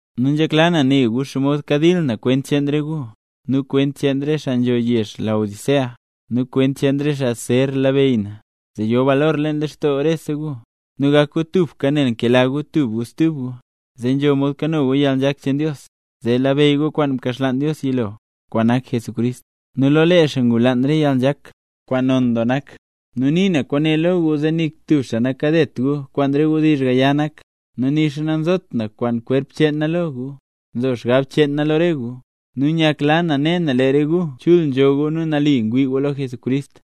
Nu nzhekla na ne gu xomod kadil na kwent cheen re gu, nu kwent cheen re xaa nzho yezh Laodicea, nu kwent cheen re xaa zer labeyy na, zee yo balor leen lextoo rese gu, nu gak gu tubka nel nkela gu tub gu stub gu, zee nzho mod kano gu yalnzhak cheen Dios, zee labeyy gu kwaan mkaxlaan Dios yilo, kwaan nak Jesucrist; nu lo lee xaa ngulaan re yalnzhak, kwaan non doo nak. Nu nii na kwaane lo gu zee nik tub xaa nakadet gu kwaan re wdizh gaya nak. Nu nixa nanzot na kwaan kwerp cheen na lo gu, nzo xgab cheen na lo re gu, nu nyakla na ne na lee re gu chul nzho gu nu nali ngwii gu lo Jesucrist.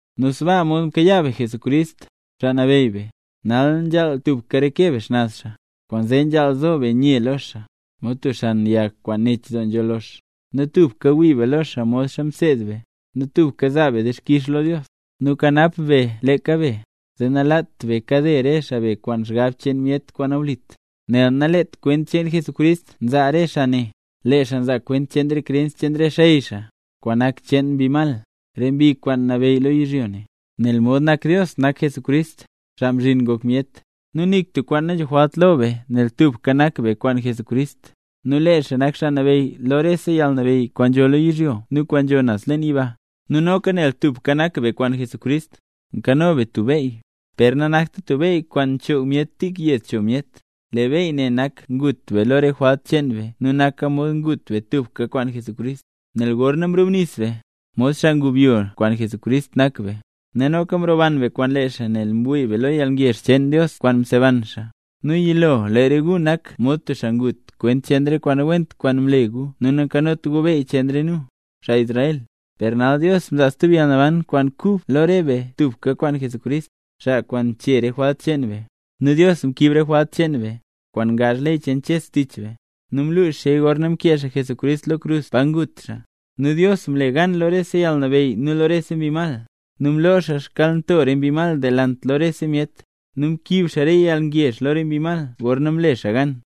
Nu sbaa mod mkayaa be Jesucrist, Xaa Nabeyy be, nal nzhaal tubka reke be xnaz xaa, kwaanzee nzhaal zo be nye lo xaa, mod tub xan yag kwaan nech doo nzho lox, nu tubka wii be lo xaa modxa mseed be, nu tubka zaa be dixkix lo Dios. Nu kanap be leeka be, zee nalaat be kade re xaa be kwaan xgab cheen myet kwaan nawlit, nel naleet kwent cheen Jesucrist nzaa re xaa ne, lee xaa nzaa kwent cheen re krens cheen re xey xaa, kwaan nak cheen mbi mal, re mbi kwaan nabeyy lo yizhyo ne. Nel mod nak Dios nak Jesucrist, xaa mzhin ngok myet, nu nik tub kwaan nanzho jwalt lo be nel tubka nak be kwaan Jesucrist, nu lee xaa nak Xaa Nabeyy lo rese yalnabeyy kwaan nzho lo yizhyo ne nu kwaan nzho naz leen yiba. Nu noka nel tubka nak be kwaan Jesucrist, nkano be tub beyy, per nanakta tub beyy kwaan nak choog myet tik yed cho myet, lee beyy ne nak ngut be lo re jwalt cheen be nu naka mod ngut be tubka kwaan Jesucrist, nel gorna mrubnis be, mod xaa ngubyo kwaan Jesucrist nak be, nu noka mroban be kwaan lee xaa nel mwii be lo yalngezh cheen Dios kwaan mseban xaa. Nu yilo re gu nak mod tub xaa ngut kwent cheen re kwaan nawent kwaan mle gu nu nanzhot gu beyy cheen re nu, xaa Israel, per nal Dios mzaa stub yalnaban kwaan kub lo re be tubka kwaan Jesucrist, xaa kwaan mchee re jwalt cheen be. Nu Dios mkiib re jwalt cheen be, kwaan ngaazh ley cheen Ches tich be; nu mlux xaaya gorna mkee xaa Jesucrist lo krus pa ngut xaa. Nu Dios mle gan lo rese yalnabeyy nu lo rese mbi mal, nu mloo xaa xkyalnto re mbi mal delant lo rese myet, nu mkiib xaa re yalngezh lo re mbi mal gorna mle xaa gan.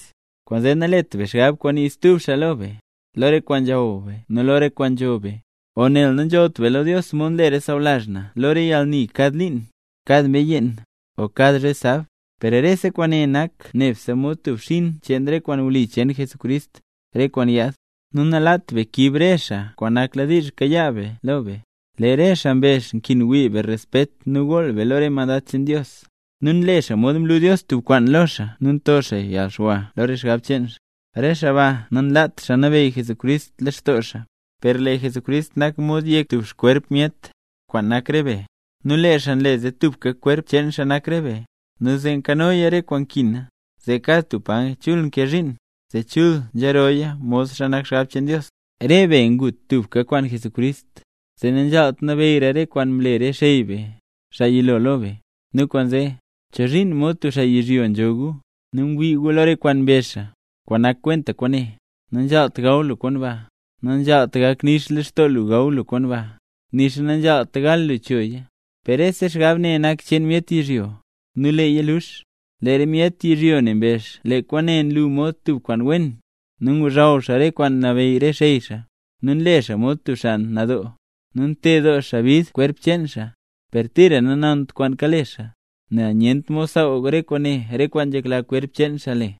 Kwaanzee nalet be xgab kwaan nii stub xaa lo be, lo re kwaan nzhaw be nu lo re kwaan nzho be, o nel nanzhollt be lo Dios mod nle re xaa sawlazh na lo re yalni kad liin, o kad mbee yeen, o kad zhe sab. Per rese kwaane nak nebse mod tub xbzhin cheen re kwaan wli cheen Jesucrist, re kwaan yaad. Nu nalaat be kiib re xaa re kwaan nakladiizh kayaa be lo be. Lee re xaa mbezh nkin wii be respet nu gool be lo re mandad cheen Dios. Nu nle xaa mod mlu Dios tub kwaan lo xaa nu nto xaa yalxwa lo re xgab cheen xaa. Re xaa ba nanlaat nabeyy Jesucrist leen lextoo xaa. Per lee Jesucrist nak mod yek tub xkwerp myet, kwaan nak re be; nu lee xaa nle zee tubka kwerp cheen xaa nak re be, nu zee nkanoya re kwaan nkina, zee kad tub paya chul nkee zhiin, zee chul nzhirooya modxa nak xgab cheen Dios. Re be ngut tubka kwaan Jesucrist, zee nanzhaalt nabeyyra re kwaan mle re xey be, xaa yilo lo be. Nu kwaanzee, ¿chozhiin mod tub xaa yizhyo ne nzho gu, nel ngwii gu lo re kwaan mbezh xaa? Kwaan nak kwenta kwaane: “Nanzhaalt gaw lu kwaan ba”. “Nanzhaalt gak nix lextoo lu gaw lu kwaan ba”. “Nixa nanzhaalt gal lu choya”. Per rese xgab ne nak cheen myet yizhyo, nu leeya lux. Lee re myet yizhyo ne mbezh lee kwaane nlu mod tub kwaan wen, nu ngozhaw xaa re kwaan nabeyy re xey xaa, nu nle xaa mod tub xaa nadoo, nu nted doo xaa bid kwerp cheen xaa. Per tira nanont kwaan kale xaa, nel nyent mod saaw re kwaane kwaan nzhekla kwerp cheen xaa le.